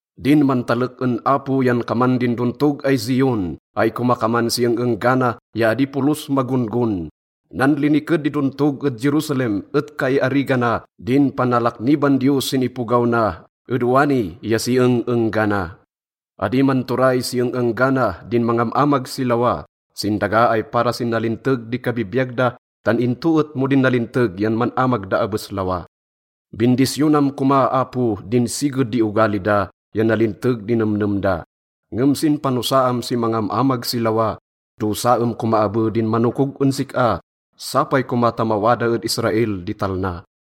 Din mantalek en Apo yan kaman din dontog ay Zion ay komakaman si eng-enggana ya adi polos magon-gon. Nanliniked di dontog ed Jerusalem et kaiarigana din panalakniban Diyos sin ipogaw na ed wani ya si eng-enggana. Adi manturay si eng-enggana din mangam-amag si lawa sin daga ay para sin nalinteg di kabibiyag da tan into et mo din nalinteg yan man-amag da abes lawa. Bindisyonam koma, Apo, din siged di ogali da ya nalinteg di nemnem da. Ngem sin panosaam si mangam-amag si lawa, dosaem koma abe din manokog en sik-a. Sapay koma ta mawada ed Israel di talna!